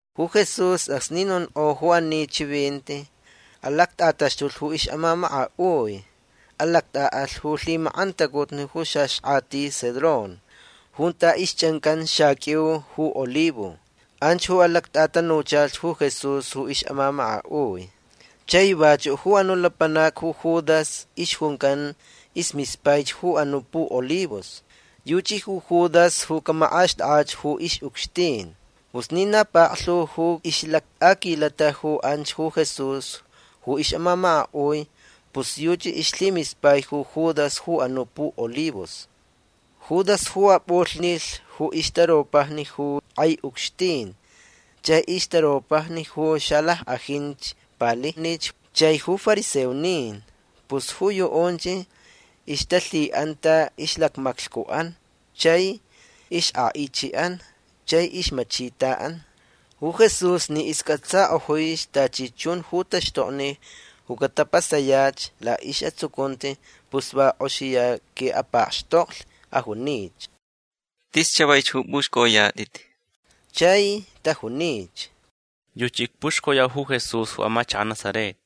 Ju Jesús acsni nonk'o ju ani chivinti alact'ataxtulh ju ix'amamaka'ui. Alact'a'alh ju lhimak'antacutni ju xaxk'ati Cedrón junta ixch'ancan xaq'uiu ju olivo. Anch ju alact'atanuchalhch ju Jesús ju ix'amamaka'ui. Chai vachu' ju anu' lapanac ju Judas ixjuncan ismispaich ju anu' pu'olivos. Yuchi ju Judas ju camak'axt'ak'ach ju ix'ucxtin. Pus ni na paklhu ju ix'alact'aquilata ju anch ju Jesús ju ix'amamaka'ui pus yuchi ixlhimispaich ju Judas ju anu' pu'olivos. Judas ju ap'ulhnilh ju ixtaropajni ju k'ai ucxtin chai ixtaropajni ju xalack'ajinch palijnich chai ju fariseonin. Pus ju yu'unch ixtalhi'anta ixlacmaclhcu'an chai ixk'a'ichi'an chai ixmachita'an. Ju Jesús ni isc'atsak'ojuich tachi chun ju taxtokni ju catapasayach la'is'atsucunti pus va k'oxiya qui'apakxtoklh. Ajunich: ―Tis chavaich ju p'uxc'oyat'it. Chai tajunich: ―Yuchi icpuxcoyau ju Jesús ju amachaka' Nazaret.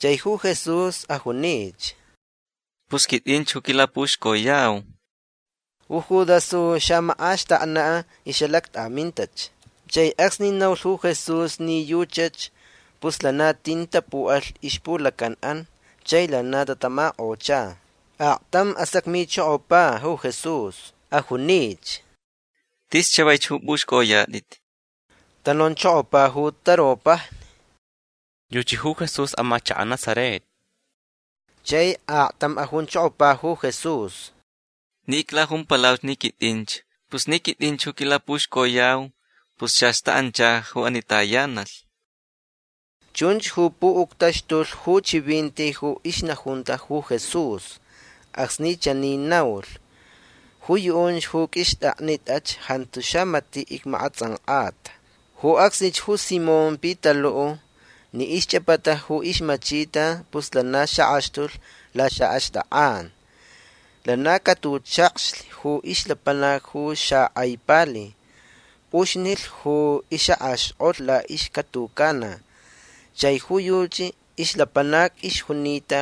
Chai ju Jesús ajunich: ―Pus quit'inch ju quilapuxcoyau. Ju Judas ju xa'amak'axtakna' ix'alact'amintach. Chai acsni naulh ju Jesús ni yuchach pus lana tin tapu'alh ixpulacan'an chai lana tatamak'ocha. Aktam asacmichokopa ju Jesús. Ajunich: ―Tis chavaich ju p'uxc'oyat'it. Tanonchokopa ju taropajni: ―Yuchi ju Jesús amachaka' Nazaret. Chai aktam ajunchokopa ju Jesús: ―Ni iclajumpalauch ni quit'inch. Pus ni quit'inch ju quilapuxcoyau pus chach ta'ancha ju ani tayanalh. Chunch ju pu'uctaxtulh ju chivinti ju ixnajunta ju Jesús acsni chani naulh: “Ju yu'unch ju q'uixt'aknit'ach jantu xamati' icmak'ats'ank'ata”. Ju acsnich ju Simón Pitalu' ni ixch'apata ju ixmachita pus lana xak'axtulh laxa'axt'ak'an. Lana catuchakxlh ju ixlapanac ju xak'ai pali. P'uxnilh ju ix'ak'axk'olh la'ixcatucana. Chai ju yuchi ixlapanac ixjunita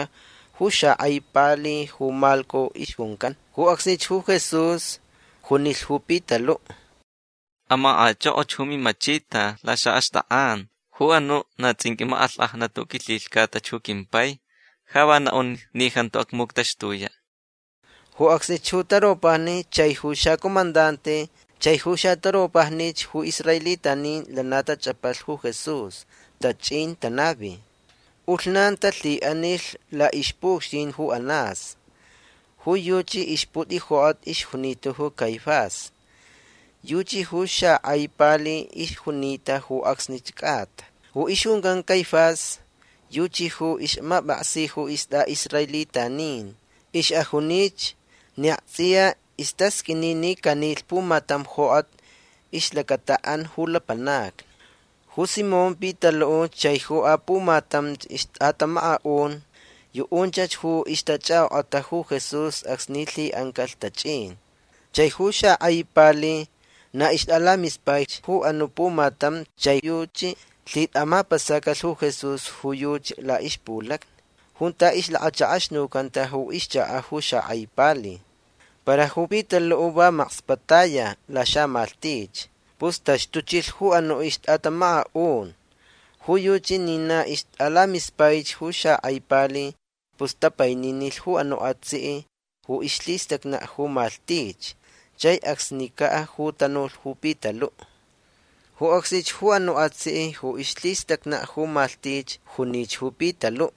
ju xak'ai pali ju Malco ixjuncan. Ju acsnich ju Jesús junilhch ju Pitalu': ―Amak'ach'ok'och ju mimachita laxa'axt'ak'an. Ju anu' na ts'inq'ui mak'alhk'ajnat ju quilhilhcatach ju quimpai ja va na'un ni jantu acmuctaxtuya'. Ju acsnich ju taropajni chai ju xacomandante chai ju xataropajnich ju israelitanin lana tach'apalh ju Jesús. Tach'in tanavi. P'ulhnan talhi'anilh la'ixpu'ucxtin ju Anás. Ju yuchi ixput'ijok'at ixjunita ju Caifás. Yuchi ju xak'ai pali ixjunita ju acsni c'ata. Ju ixjuncan Caifás yuchi ju ix'amap'aksi ju ist'a'israelitanin. Ix'ajunich ni akts'iya istasq'uini ni canilh pumatam jok'at ixlacata'an ju lapanacni. Ju Simón Pitalu' chai ju apumatamch ixt'atamaka'un yu'unchach ju ixtach'ak'ok'ata ju Jesús acsni lhi'ancalh tach'in. Chai ju xak'ai pali na ixt'alamispaich ju anu' pumatam chai yuchi lhit'amapasacalh ju Jesús ju yuchi la'ixpulacni junta ixlakachak'axnucanta ju ixchaka' ju xak'ai pali. Para ju Pitalu' va makspa' taya laxamalhtich. Pus taxtuchilh ju anu' ixt'atamamaka'un. Ju yuchi ni na ixt'alamispaich ju xak'ai pali pus tapaininilh ju anu' atsi' ju ixlhistacna' ju malhtich. Chai acsnica' ju tanulh ju Pitalu'. Ju acsnich ju anu' atsi' ju ixlhistacna' ju malhtich junich ju Pitalu':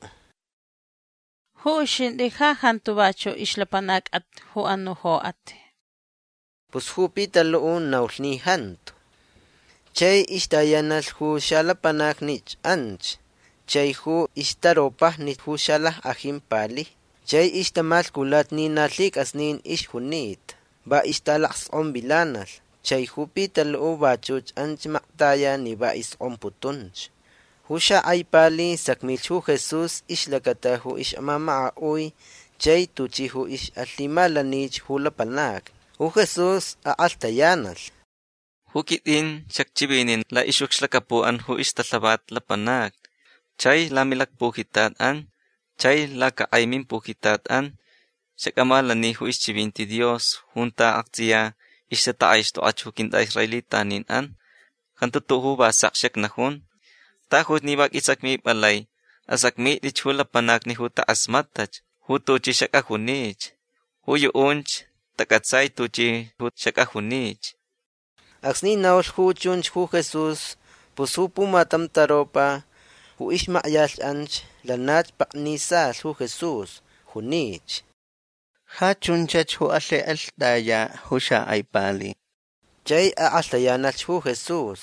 ―Ju uxint'i ja jantu vachu' ixlapanac'at ju anu' jok'at. Pus ju Pitalu' naulh ni jantu. Chai ixtayanalh ju xalapanacnich anch chai ju ixtaropajni ju xalack'ajin palijni. Chai ixtamalhculata ni na lhic'asnin ixjunita. Va ixtalacsk'onvilanalh. Chai ju Pitalu' vachuch anch maktaya ni va isk'omputunch. Ju xak'ai pali sacmilh ju Jesús ixlacata ju ix'amamaka'ui chai tuchi ju ix'alhimalanich ju lapanacni. Ju Jesús ak'alhtayanalh: ―Ju quit'in xacchivinin la'ix'ucxlacapu'an ju ixtalhavat lapanacni. Chai lamilacpujitat'an chai lacak'ai mimpujitat'an xac'amalani ju ixchivinti Dios junta akts'iya ixtatak'aixt'ok'ach ju quint'a'israelitanin'an. Jantu tu'u' ju va sek xacnajun. Tajuch ni va q'uisacmip'alai. Asacmit'ich ju lapanacni ju tak'asmat'ach ju tuchi xac'ajunich. Ju yu'unch tac'atsaich tuchi ju xac'ajunich. Acsni naulh ju chunch ju Jesús pus ju pumatam taropa ju ixmakyalh anch lanach paknisalh ju Jesús. Junich: ―Ja chunchach ju alhik'alht'aya' ju xak'ai pali. Chai ak'alhtayanalh ju Jesús: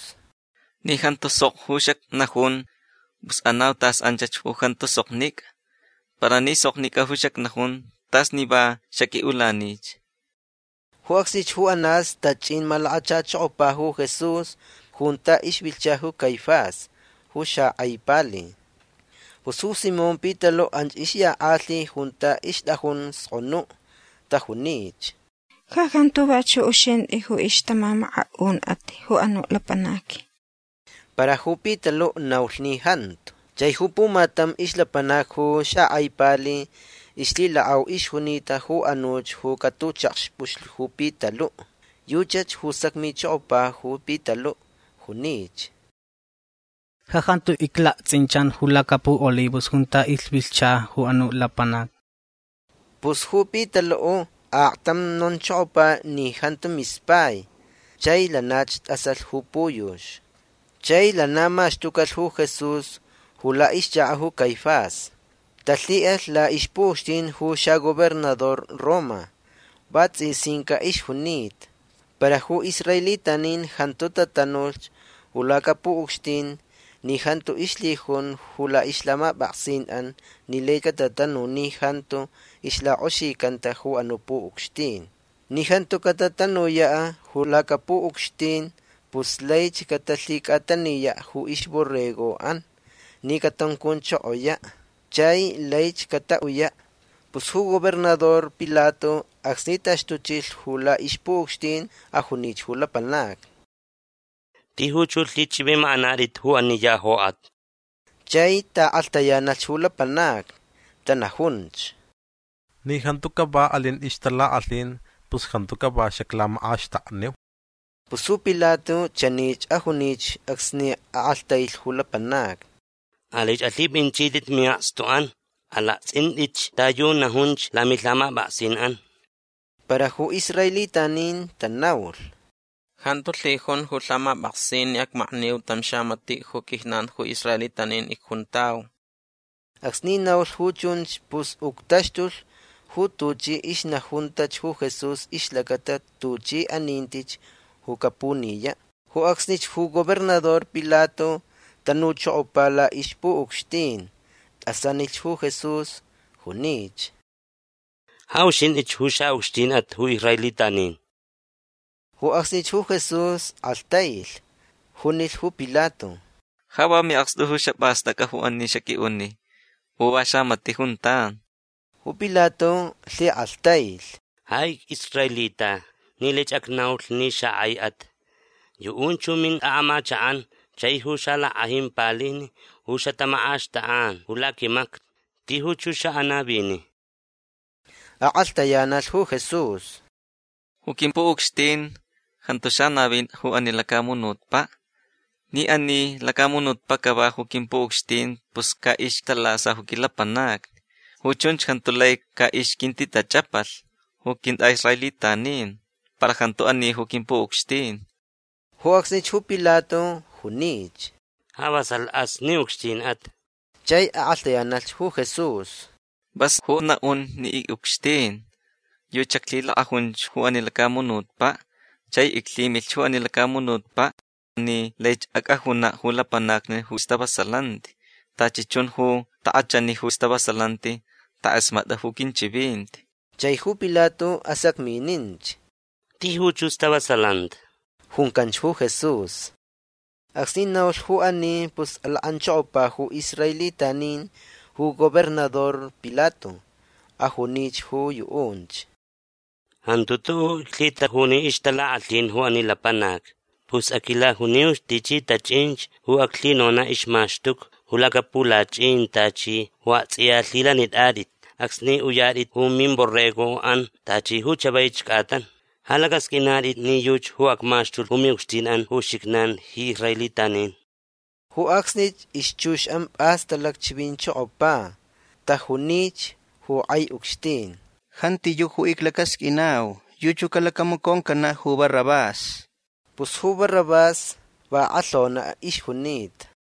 ―Ni jantu sok ju xacnajun pus anauch tas anchach ju jantu soknic'a. Para ni soknic'a ju xacnajun t'as ni va xaq'ui'ulanich. Ju acsnich ju Anás tach'in malakachachokopa ju Jesús junta ixvilhcha ju Caifás ju xak'ai pali. Pus ju Simón Pitalu' anch ixyak'alhi junta ixt'ajun sk'onu'. Tajunich: ―Ja jantu vachu' uxint'i ju ixtamamaka'un'at ju anu' lapanac. Para ju Pitalu' naulh ni jantu. Chai ju pumatam ixlapanac ju xak'ai pali ixlhilak'au ixjunita ju anuch ju catuchakxp'uxlh ju Pitalu'. Yuchach ju sacmichokopa ju Pitalu'. Junich: ―Ja jantu iclakts'inchan ju lacapu'olivos junta ixvilhcha ju anu' lapanac. Pus ju Pitalu' aktam nonchokopa ni jantu mispai. Chai lanach t'asalh ju puyux. Chai lana maxtucalh ju Jesús ju la'ixchaka' ju Caifás. Talhi'alhch la'ixpu'ucxtin ju xagobernador Roma. Vats'isinca' ixjunita. Para ju israelitanin jantu tatanulh ju lacapu'ucxtin ni jantu ixlhijun ju la'ixlhamap'aksin'an ni lai catatanu ni jantu ixlak'oxicanta ju anu' pu'ucxtin. Ni jantu catatanuya' ju lacapu'ucxtin pus laich catalhic'ataniya' ju ixborrego'an ni catuncunchokoya' chai laich cata'uyach. Pus ju gobernador Pilato acsni taxtuchilh ju la'ixpu'ucxtin ajunich ju lapanacni: ―Tijuch ju lhich'ivimak'anat'it ju ani ya jok'at. Chai ta'ak'alhtayanalh ju lapanacni. Tanajunch: ―Ni jantu cava alin ixtalak'alhin pus jantu cava xaclamak'axtakniu. Pus ju Pilato chanich ajunich acsni ak'alhtailh ju lapanacni: ―Alaich alhip'inchit'it mi'akstu'an. Alakts'int'itch ta yu najunch lamilhamap'aksin'an. Para ju israelitanin tanaulh: ―Jantu lhijun ju lhamap'aksin ni acmakniu tam xamati' ju quijnan ju israelitanin icjuntau. Acsni naulh ju chunch pus uctaxtulh ju tuchi ixnajuntach ju Jesús ixlacata tuchi anintich ju capuniya'. Ju acsnich ju gobernador Pilato tanuchokopa ju la'ixpu'ucxtin. T'asanilh ju Jesús. Junich: ―Ja uxint'ich ju xa'ucxtin'at ju israelitanin. Ju acsnich ju Jesús k'alhtailh. Junilh ju Pilato: ―Ja va mi'akstu xap'ast'ac'a ju ani xaq'ui'uni u va xamati' juntan. Ju Pilato lhik'alhtailh: ―Ja ic'israelita ni laich acnaulh ni xak'aich'at. Yu'unch ju mint'a'amachak'an chai ju xalack'ajin palijni ju xatamak'axt'ak'an ju laquimacni. Tijuch ju xa'anavini. Ak'alhtayanalh ju Jesús: ―Ju quimpu'ucxtin jantu xanavin ju ani lacamunutpa'. Ni ani lacamunutpa' cava ju quimpu'ucxtin pus ca'ixtalasa ju quilapanacni. Ju chunch jantu lai ca'ixquintitach'apalh ju quint'a'israelitanin. Para jantu ani ju quimpu'ucxtin. Ju acsnich ju Pilato junich: ―Ja vasalh'as ni ucxtin'at. Chai ak'alhtayanalh ju Jesús: ―Vas ju na'un ni ic'ucxtin. Yuchi xaclhilak'ajunch ju ani lacamunutpa'. Chai iclhimilhch ju ani lacamunutpa' ni laich ac'ajuna' ju lapanacni ju stavasalanti. Tachi chun ju tak'achani ju stavasalanti tak'asmat'a ju quinchivinti. Chai ju Pilato asacmininch: ―Tijuch ju stavasalanti. ―Juncanch ju Jesús. Acsni naulh ju ani pus alak'anchokopa ju israelitanin ju gobernador Pilato. Ajunich ju yu'unch: ―Jantu tu'u' iclhitajuni ixtalak'alhin ju ani lapanac. Pus aquilajuniuch tichi tach'inch ju aclhinona' ixmaxtuca ju lacapulach'in tachi ju akts'iya lhilanit'at'it acsni uyat'it ju mimborrego'an tachi ju chavaich c'atan. Ja lac'asq'uinat'it ni yuchi ju acmaxtulh ju mi'ucxtin'an ju uxijnan ji israelitanin. Ju acsnich ixchux'an p'as talacchivinchokopa. Tajunich ju k'ai ucxtin: ―Jantiyu' ju iclacasq'uinau. Yuchi ju calacamaconcana' ju Barrabás. Pus ju Barrabás va ak'alhona' ixjunita.